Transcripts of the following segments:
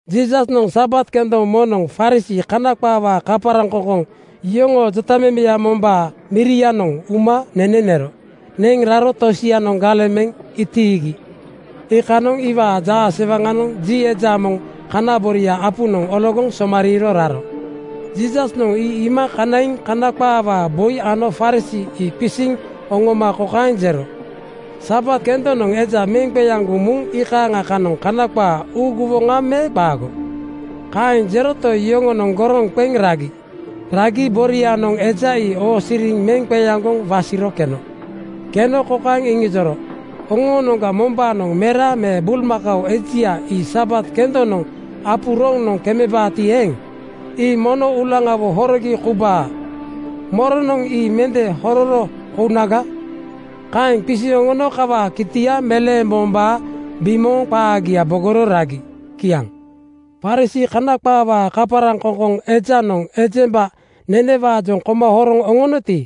Jiisasnoŋ Sabat kendoŋ moŋnoŋ Farisii (Kana qaawaa kaparaŋkoŋkoŋ) yoŋoo jotamemeya mombaa mirianoŋ uma nene nero. Neŋ raro tosianoŋ galeŋ meŋ itiigi. Iikanoŋ iwaa jaasewaŋanoŋ ji eja moŋ kana boria apunoŋ ologoŋ somariiro raro. Jiisasnoŋ ii iima kanaiŋ Kana qaawaa boi ano Farisii ii qisiŋ oŋoma kokaeŋ jero, “Sabat kendonoŋ eja meŋ qeaŋgoŋ muŋ iikaaŋa kanoŋ Kana qaa uuguwoŋa me qaago?” Kaeŋ jeroto, yoŋonoŋ goroŋ qeŋ ragi. Ragi borianoŋ eja ii oosiriŋ meŋ qeaŋgoŋ wasiro keno. Keno kokaeŋ iŋijoro, “Oŋoonoŋga mombaanoŋ mera me bulmakao ejia ii Sabat kendonoŋ apu roŋnoŋ kemebaati eeŋ, ii mono uulaŋawo horogi koubaa. Moronoŋ ii mende hororo kounaga?” Kaeŋ qisiŋ oŋono kawaa kitia meleembombaa bimooŋ qaagia bogoro ragi. Kiaŋ. Farisii (Kana qaawaa kaparaŋkoŋkoŋ) ejanoŋ ejemba nenewaajoŋ koma horoŋ oŋonoti,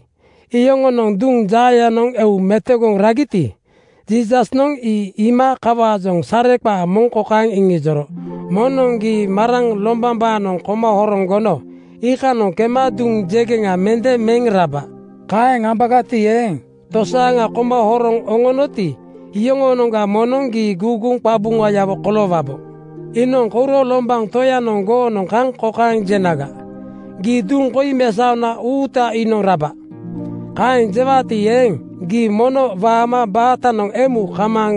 iyoŋonoŋ duŋ jaayanoŋ eu metogoŋ ragiti, Jiisasnoŋ ii iima kawaajoŋ sareqaa moŋ kokaeŋ iŋijoro, “Moŋnoŋ gii maraŋ (agomiŋ aoao) lombambaanoŋ koma horoŋ gono iikanoŋ kema duŋ jegeŋa mende meŋ raba. Kaeŋ ambagati eeŋ, tosaaŋa koma horoŋ oŋonoti, iyoŋoonoŋga moŋnoŋ gii guuguŋ qabuŋayawo koloowabo. “Iinoŋ kouro lombaŋ toyanoŋ goonoŋ kaŋ kokaeŋ jenaga, ‘Gii duŋ koi mesaona uuta iinoŋ raba.’ Kaeŋ jewaati eeŋ, gii mono waama baatanoŋ emu kamaaŋ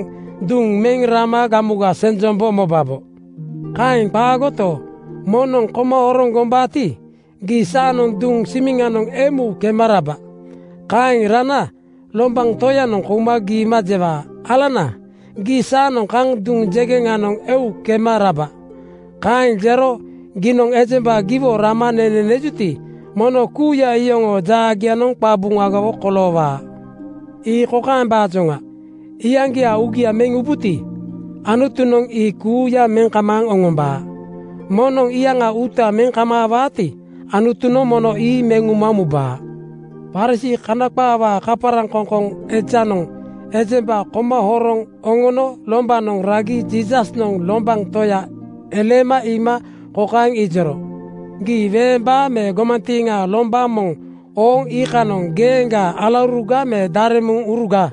duŋ meŋ rama gamuga senjombo mobabo. Kaeŋ qaagoto, moŋnoŋ koma horoŋ gombaati, gii saanoŋ duŋ simiŋanoŋ emu kema raba. Kaeŋ rana lombaŋ toyanoŋ kouma giima jewaa, ‘Alana, gii saanoŋ kaŋ duŋ jegeŋanoŋ eu kema raba’. Kaeŋ jero giinoŋ ejemba giwo rama nene nejuti, mono kuuya iyoŋoo jaagianoŋ qabuŋagawo koloowaa. Ii kokaembaajoŋa: Iyaŋgiaa uugia meŋ ubuti, Anutunoŋ ii kuuya meŋ kamaaŋ oŋombaa. Moŋnoŋ iyaŋa uuta meŋ kamaawaati, Anutunoŋ mono ii meŋ uma mubaa.” Farisii (Kana qaawaa kaparaŋkoŋkoŋ) ejanoŋ ejemba koma horoŋ oŋono lombanoŋ ragi Jiisasnoŋ lombaŋ toya eleema iima kokaeŋ ijoro, “Gii weembaa me gomantiiŋaa lombaŋ moŋ ooŋ iikanoŋ geeŋgaa alauruga me daremuŋuruga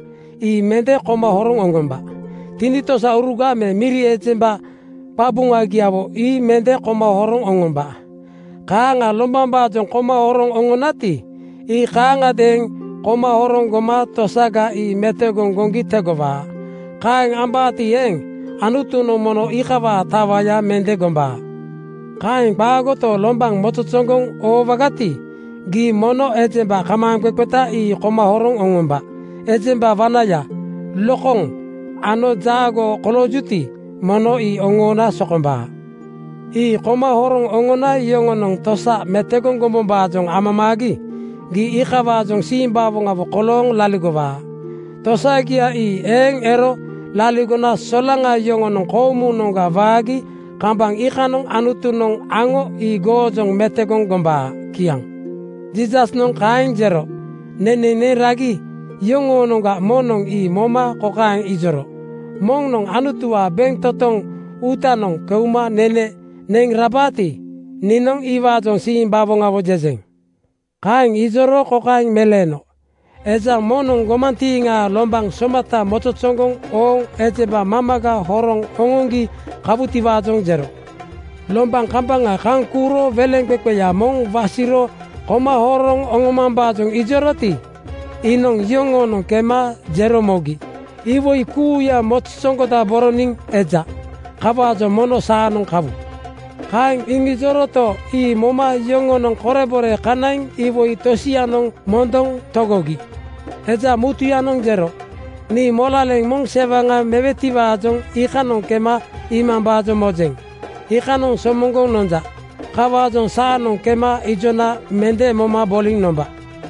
ii mende koma horoŋ oŋomba. Tinitosauruga me miri ejemba qabuŋagiawo ii mende koma horoŋ oŋomba. Kaaŋa lombambaajoŋ koma horoŋ oŋonati, ii kaaŋiadeeŋ koma horoŋ goma tosaga ii metogoŋ goŋgi tegowaa. Kaeŋ ambaati eeŋ, Anutunoŋ mono iikawaa tawaya mende gombaa. “Kaeŋ qaagoto, lombaŋ mozozoŋgoŋ oowagati, gii mono ejemba kamaaŋqeqeta ii koma horoŋ oŋomba. Ejemba wanaya, lokoŋ ano jaagoo koloojuti, mono ii oŋoona sokombaa. Ii koma horoŋ oŋona yoŋonoŋ tosa metogoŋ gombombaajoŋ amamaagi gii iikawaajoŋ simbawoŋawo kolooŋ laligowaa. Tosagia ii eeŋ ero laligona solaŋa yoŋonoŋ koomunoŋga waagi kambaŋ iikanoŋ Anutunoŋ aŋo ii goojoŋ metogoŋ gombaa.” Kiaŋ. Jiisasnoŋ kaeŋ jero nene neŋ ragi yoŋoonoŋga moŋnoŋ ii moma kokaeŋ ijoro, “Moŋnoŋ Anutuwaa bentotoŋ uutanoŋ keuma nene neŋ rabaati, niinoŋ iwaajoŋ simbawoŋawo jejeŋ.” Kaeŋ ijoro kokaeŋ meleeno, “Eja moŋnoŋ gomantiiŋaa lombaŋ somata mozozoŋgoŋ ooŋ ejemba mamaga horoŋ oŋoŋgi kawutiwaajoŋ jero. Lombaŋ kambaŋa kaŋ kuuro weleŋqeqeya moŋ wasiro koma horoŋ oŋomambaajoŋ ijoroti, iinoŋ yoŋoonoŋ kema jero mogi, ‘Iwoi kuuya mozozoŋgodaboroniŋ eja. Kawaajoŋ mono saanoŋ kawu.’ Kaeŋ iŋijoroto, ii moma yoŋonoŋ korebore kanaiŋ iwoi tosianoŋ mondoŋ togogi. Eja mutuyanoŋ jero, ‘Nii molaleŋ moŋ sewaŋa mewetiwaajoŋ iikanoŋ kema iimambaajoŋ mojeŋ. Iikanoŋ somoŋgoŋ nonja. Kawaajoŋ saanoŋ kema ijona mende moma boliŋ nomba.’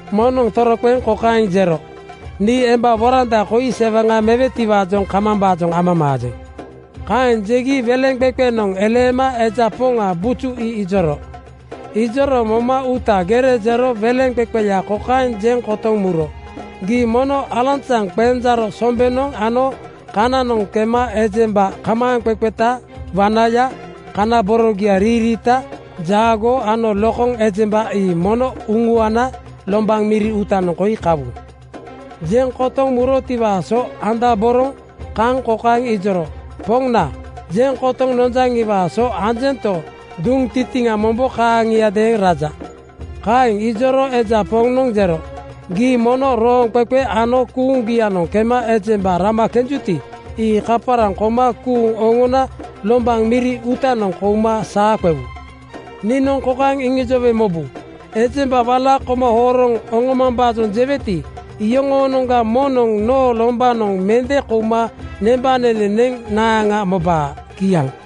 Moŋnoŋ toroqeŋ kokaeŋ jero, ‘Nii emba woranda koi sewaŋa mewetiwaajoŋ kamambaajoŋ amamaajeŋ.’ “Kaeŋ jegi weleŋqeqenoŋ eleema eja poŋa buju ii ijoro. Ijoro moma uuta gere jero weleŋqeqeya kokaeŋ jeŋ kotoŋ muro, ‘Gii mono alanzaŋ qenjaaro sombenoŋ ano kananoŋ kema ejemba kamaaŋqeqeta, wanaya, kana borogia riiriita, jaagoo ano lokoŋ ejemba ii mono uŋuana lombaŋ miri uutanoŋ koi kawu.’ Jeŋ kotoŋ murotiwaa so andaboroŋ kaŋ kokaeŋ ijoro, ‘Poŋna, jeŋ kotoŋ nonjaŋiwaa so anjento, duŋ tintiŋa mombo kaaŋiadeeŋ raja.’ “Kaeŋ ijoro eja poŋnoŋ jero, ‘Gii mono rooŋqeqe ano kuuŋgianoŋ kema ejemba rama kenjuti, ii kaparaŋ koma kuuŋ oŋona lombaŋ miri uutanoŋ kouma saa qewu. Niinoŋ kokaeŋ iŋijowe mobu: Ejemba wala koma horoŋ oŋomambaajoŋ jeweti, iyoŋoonoŋga moŋnoŋ noo lombanoŋ mende kouma nembanene neŋ naaŋa mobaa.’” Kiaŋ.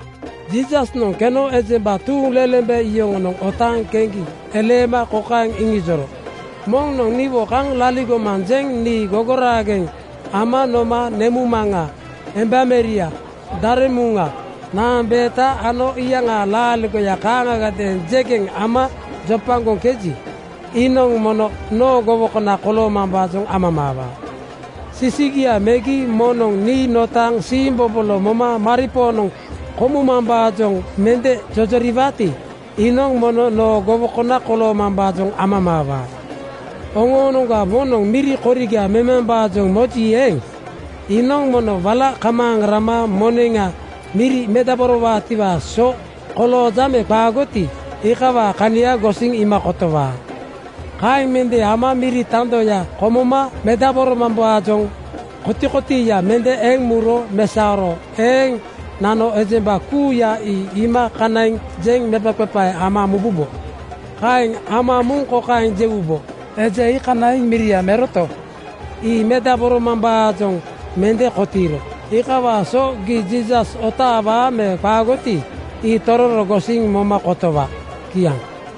Jiisasnoŋ keno ejemba tuuŋlelembe yoŋonoŋ otaaŋ keŋgi eleema kokaeŋ iŋijoro, “Moŋnoŋ niwo kaŋ laligomanjeŋ nii gogoraageŋ ama noma nemuŋmaŋa, embameria, daremuŋa, naambeeta ano iyaŋaa laaligoya kaaŋagadeeŋ jegeŋ ama jopagoŋkeji, iinoŋ mono noo gowokona koloomambaajoŋ amamaawaa. Sisigia megi moŋnoŋ nii notaaŋ siimbobolo moma maripoonoŋ komumambaajoŋ mende jojoriwaati, iinoŋ mono noo gowokona koloomambaajoŋ amamaawaa. “Oŋoonoŋga moŋnoŋ miri koriga memambaajoŋ moji eeŋ, iinoŋ mono wala kamaaŋ rama moneŋa miri medaborowaatiwaa so kolooja me qaagoti, iikawaa kania gosiŋ iima kotowaa. Kaeŋ mende ama miri tandoya komoma medaboromambaajoŋ kotikotiiya mende eŋ muro mesaoro eeŋ nano ejemba kuuya ii iima kanaiŋ jeŋ mepaqepae ama mububo. Kaeŋ ama muŋ kokaeŋ jewubo, ‘Eja ii kanaiŋ miria meroto, ii medaboromambaajoŋ mende kotiiro.’ Iikawaa so gii Jiisas otaawaa me qaagoti, ii tororo gosiŋ moma kotowa.” Kiaŋ.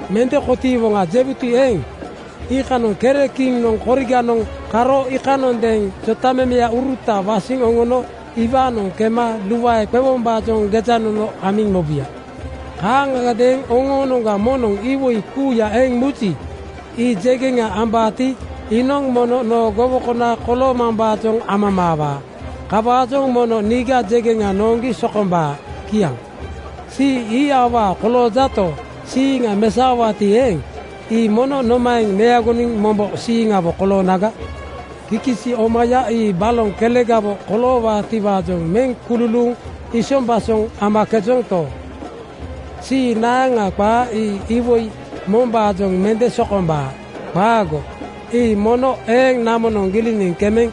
‘Mende kotiiwoŋa,’ jewuti eeŋ, iinoŋ kere kiŋnoŋ koriganoŋ karo iikanondeeŋ jotamemeuruta wasiŋ oŋono iwaanoŋ kema luae qewombaajoŋ gejanono amiŋ mobuya. Kaaŋagadeeŋ oŋoonoŋga moŋnoŋ iwoi kuuya eŋ muji, ii jegeŋa ambaati, iinoŋ mono noo gowokona koloomambaajoŋ amamaawaa. Kawaajoŋ mono niiga jegeŋa nooŋgi sokombaa.” Kiaŋ. “Sii ii awaa koloojato, siiŋa mesaowaati eeŋ, ii mono nomaeŋ meagoniŋ mombo siiŋawo koloonaga? Kikisi omaya ii baloŋ kelegawo koloowaatiwaajoŋ meŋ kululuuŋ isombasoŋ amakejonto, sii naaŋa qaa ii iwoi mombaajoŋ mende sokombaa. Qaago! Ii mono eeŋ namonoŋ giliniŋ kemeŋ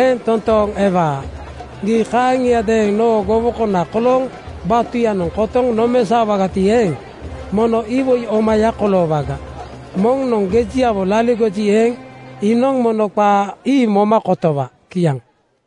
eeŋ toontooŋ ewaa. (Gii kaaŋiadeeŋ noo gowokona kolooŋ batuyanoŋ kotoŋ nomesaowagati eeŋ, mono iwoi omaya koloowaga.) Moŋnoŋ gejiawo laligoji eeŋ, iinoŋ mono qaa ii moma kotowa.” Kiaŋ.